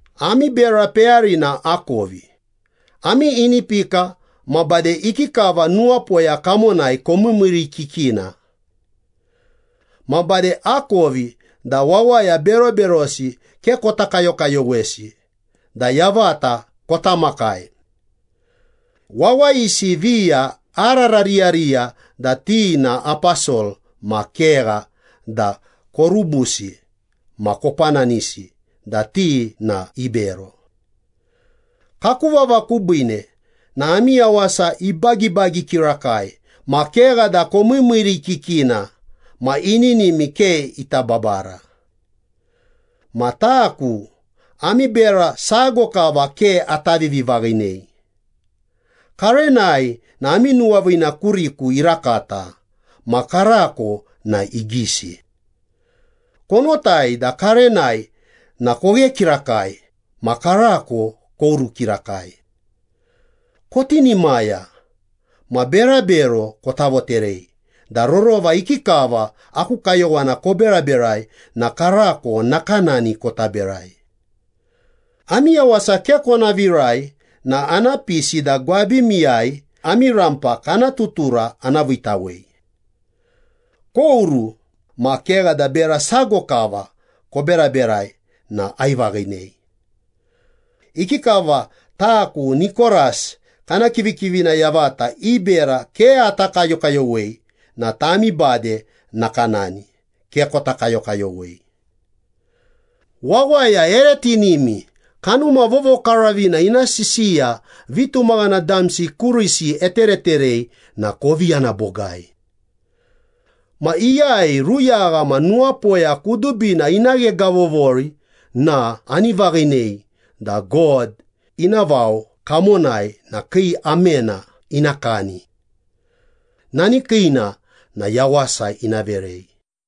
‘Ami bera peyarina akovi, ami inipika ma bade ikikava nuwapoya kamonai komiimiirikikina. Ma bade akovi da wawaya beroberosi ke kota kayokayowesi da yavata kota makai. Wawayisi viya ararariyariya da ti na aposol ma kegha da korubusi ma kopananisi da ti na ibero. Kaku vava kubiine na ami yawasa ibagibagi kirakai ma kegha da komiimiirikikina ma ininimi ke ita babara. Ma taku, ami bera sago kava ke ata vivivaghinei. Karenai na ami nuwaviina kuriku irakata ma karako na igisi. Konotai da karenai na koghe kirakai ma karako koru kirakai. Kotinimaya ma berabero kota voterei da rorova ikikava aku kayowana koberaberai na karako nakanani kota berai. Ami yawasa ke kona virai na ana pisi da gwabimiyai ami rampa kana tutura ana viitawei. Koru, ma kegha da bera sago kava koberaberai na aivaghinei. Ikikava taku Nikoras kana kivikivina yavata i bera ke ata kayokayowei na tami bade nakanani, ke kota kayokayowei.’ ‘Wawaya ere tinimi, Kanuma Vovokaravina ina sisiya vitumaghana damsi kurisi etereterei na kovi yana bogai. Ma iyai ruyagha ma nuwapoya kudubina ina ghegavovori na ani vaghinei da God ina vao kamonai na kii amena ina kani. Nani kiina na yawasa ina verei.’”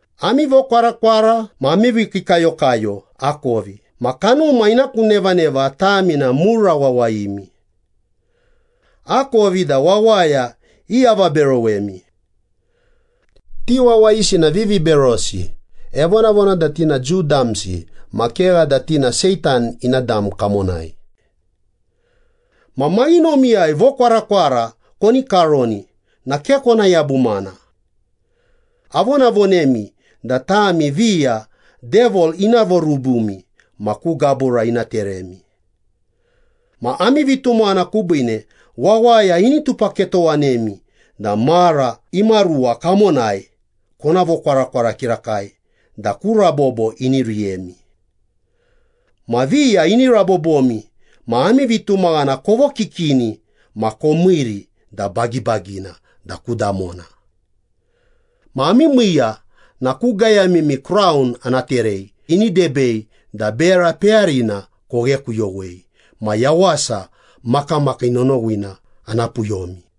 ‘Ami vokwarakwara ma ami vikiikayokayo akovi ma kanuma ina ku nevaneva tami na mura wawayimi. Akovi da wawaya iavaberowemi. Ti wawayisi na viviberosi, evonavona da ti na Jiu damsi ma kegha da ti na Seitan ina dam kamonai.’ ‘Ma maghinomiyai vokwarakwara koni karoni na ke kona yabumana. Avonavonemi da tami viya Devil ina vorubumi ma ku gabura ina teremi. Ma ami vitumaghana kubiine wawaya ini tupaketowanemi da mara imaruwa kamonai kona vokwarakwara kirakai da ku rabobo ini riyemi. Ma viya ini rabobomi ma ami vitumaghana kovokikini ma komiiri da bagibagina da ku damona. Ma ami miiya na ku gayamimi kraun ana terei ini debei da bera peyarina koghekuyowei ma yawasa makamakii nonowina ana puyomi.’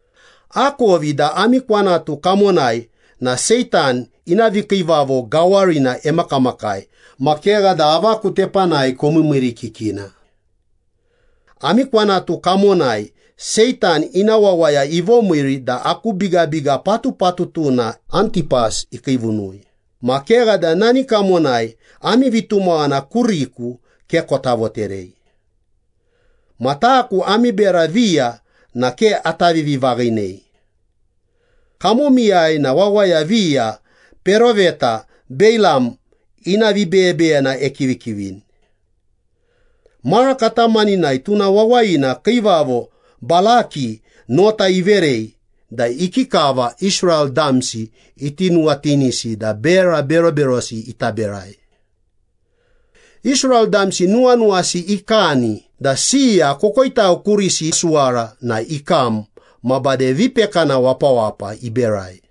‘Akovi da ami kwanatu kamonai na Seitan ina vikiivavo gawarina emakamakai ma kegha da avaku tepanai komiimiirikikina. Ami kwanatu kamonai Seitan ina wawaya ivomiiri da aku bigabiga patupatutuna Antipas ikiivunui ma kegha da nani kamonai ami vitumaghana kuriku ke kota voterei. Ma taku ami bera viya na ke ata vivivaghinei. Kamomiyai na wawaya viya peroveta Beilam ina vibeyebeyena ekivikivini. Mara katamaninai tuna wawayina kiivavo Balaki nota iverei da ikikava Israel damsi iti nuwatinisi da bera beroberosi ita berai. Israel damsi nuwanuwasi ikani da siya kokoitau kurisi isuwara na ikam ma bade vipekana wapawapa iberai.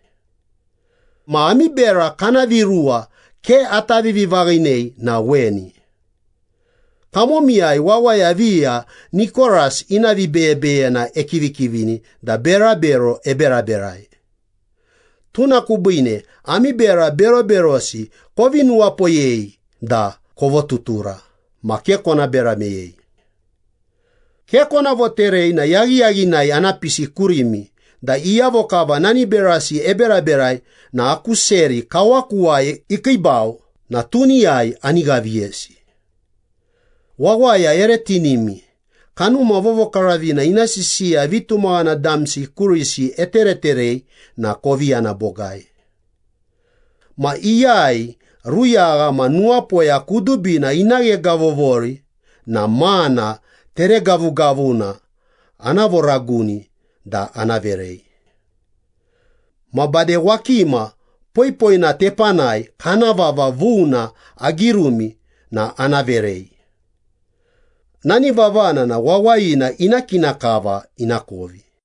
Ma ami bera kana viruwa ke ata vivivaghinei na weni. Kamomiyai wawaya viya Nikoras ina vibeyebeyena ekivikivini da berabero eberaberai. Tuna kubiine ami bera beroberosi kovi nuwapoyei da kovotutura ma ke kona bera meyei. Ke kona voterei na yaghiyaghinai ana pisi kurimi da iyavo kava nani berasi eberaberai na aku seri kawakuwai ikiibau na tuniyai ani ghaviyesi.’ ‘Wawaya ere tinimi, Kanuma Vovokaravina ina sisiya vitumaghana damsi kurisi etereterei na kovi yana bogai.’ ‘Ma iyai ruyagha ma nuwapoya kudubina ina ghegavovori na mana teregavugavuna ana voraguni da ana verei. Ma bade wakima poipoina tepanai kana vava vuna agirumi na ana verei. Nani vavana na wawayina ina kina kava inakovi.’”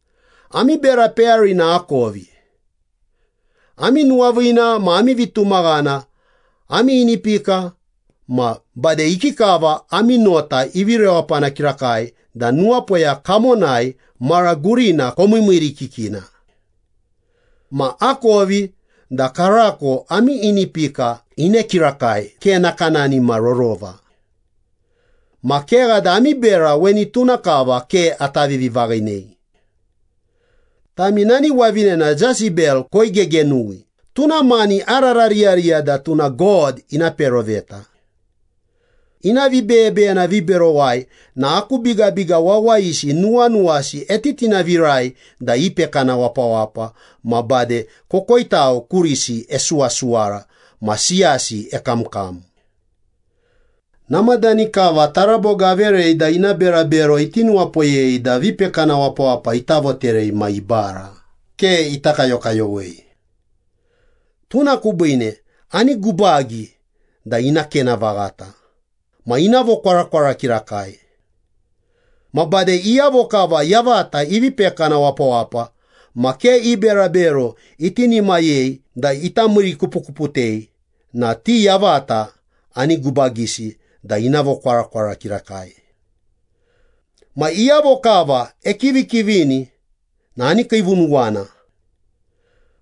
‘Ami bera peyarina akovi. Ami nuwaviina ma ami vitumaghana, ami inipika ma bade ikikava ami nota ivi rewapana kirakai da nuwapoya kamonai mara gurina komiimiirikikina. Ma akovi da karako ami inipika ine kirakai ke nakanani ma rorova. Ma kegha da ami bera weni tuna kava ke ata vivivaghinei. Tami nani wavinena Jesebel koigegenuwi, tuna mani ararariyariya da tuna God ina peroveta. Ina vibeyebeyena viberowai na aku bigabiga wawayisi nuwanuwasi etitinavirai da ipekana wapawapa ma bade kokoitau kurisi esuwasuwara ma siyasi ekamkam. Namadani kava taraboga averei da ina berabero iti nuwapoyei da vipekana wapawapa ita voterei ma ibara, ke ita kayokayowei. Tuna kubiine ani gubagi da ina kena vaghata ma ina vokwarakwara kirakai. Ma bade iyavo kava yavata ivi pekana wapawapa ma ke i berabero itinimayei da ita miirikupukuputei na ti yavata ani gubagisi da ina vokwarakwara kirakai. Ma iyavo kava ekivikivini na ani kiivunuwana.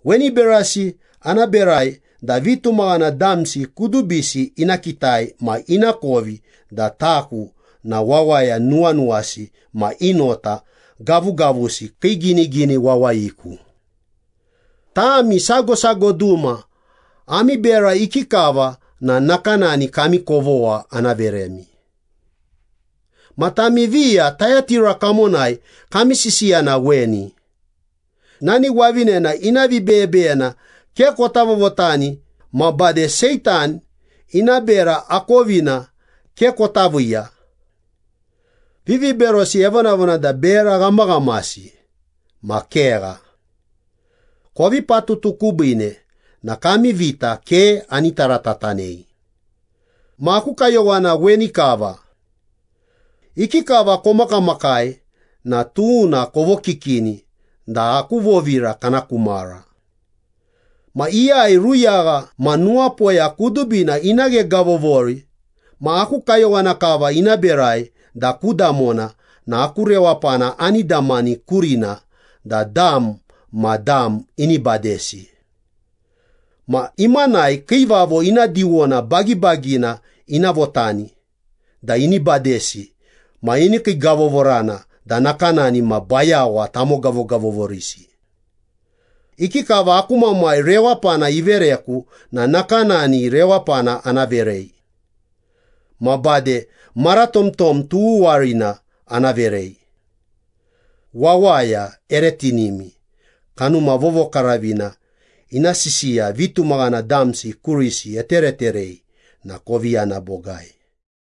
Weni berasi ana berai da vitumaghana damsi kudubisi ina kitai ma inakovi da taku na wawaya nuwanuwasi ma i nota gavugavusi kii ginigini wawayiku. Tami sago sago duma ami bera ikikava na nakanani kami kovogha ana veremi.’ ‘Ma tami viya Tayatira kamonai kami sisiya na weni. Nani wavinena ina vibeyebeyena ke kota vovotani, ma bade Seitan ina bera akovina ke kota viiya. Viviberosi evonavona da bera ghamaghamasi ma kegha. Kovi patutu kubiine na kami vita ke ani taratatanei.’ ‘Ma aku kayowana weni kava. Ikikava komakamakai na tuna kovokikini da aku vovira kana ku mara. Ma iyai ruyagha ma nuwapoya kudubina ina ghegavovori ma aku kayowana kava ina berai da ku damona na aku rewapana ani damani kurina da dam ma dam ini badesi. Ma imanai kiivavo ina diwona bagibagina ina votani da ini badesi ma ini kiigavovorana da nakanani ma bayawa tamogavogavovorisi. Ikikava aku Mamai rewapana ivereku na nakanani rewapana ana verei. Ma bade maratomtom tughuwarina ana verei.’ ‘Wawaya ere tinimi, Kanuma Vovokaravina ina sisiya vitumaghana damsi kurisi etereterei na kovi yana bogai.’”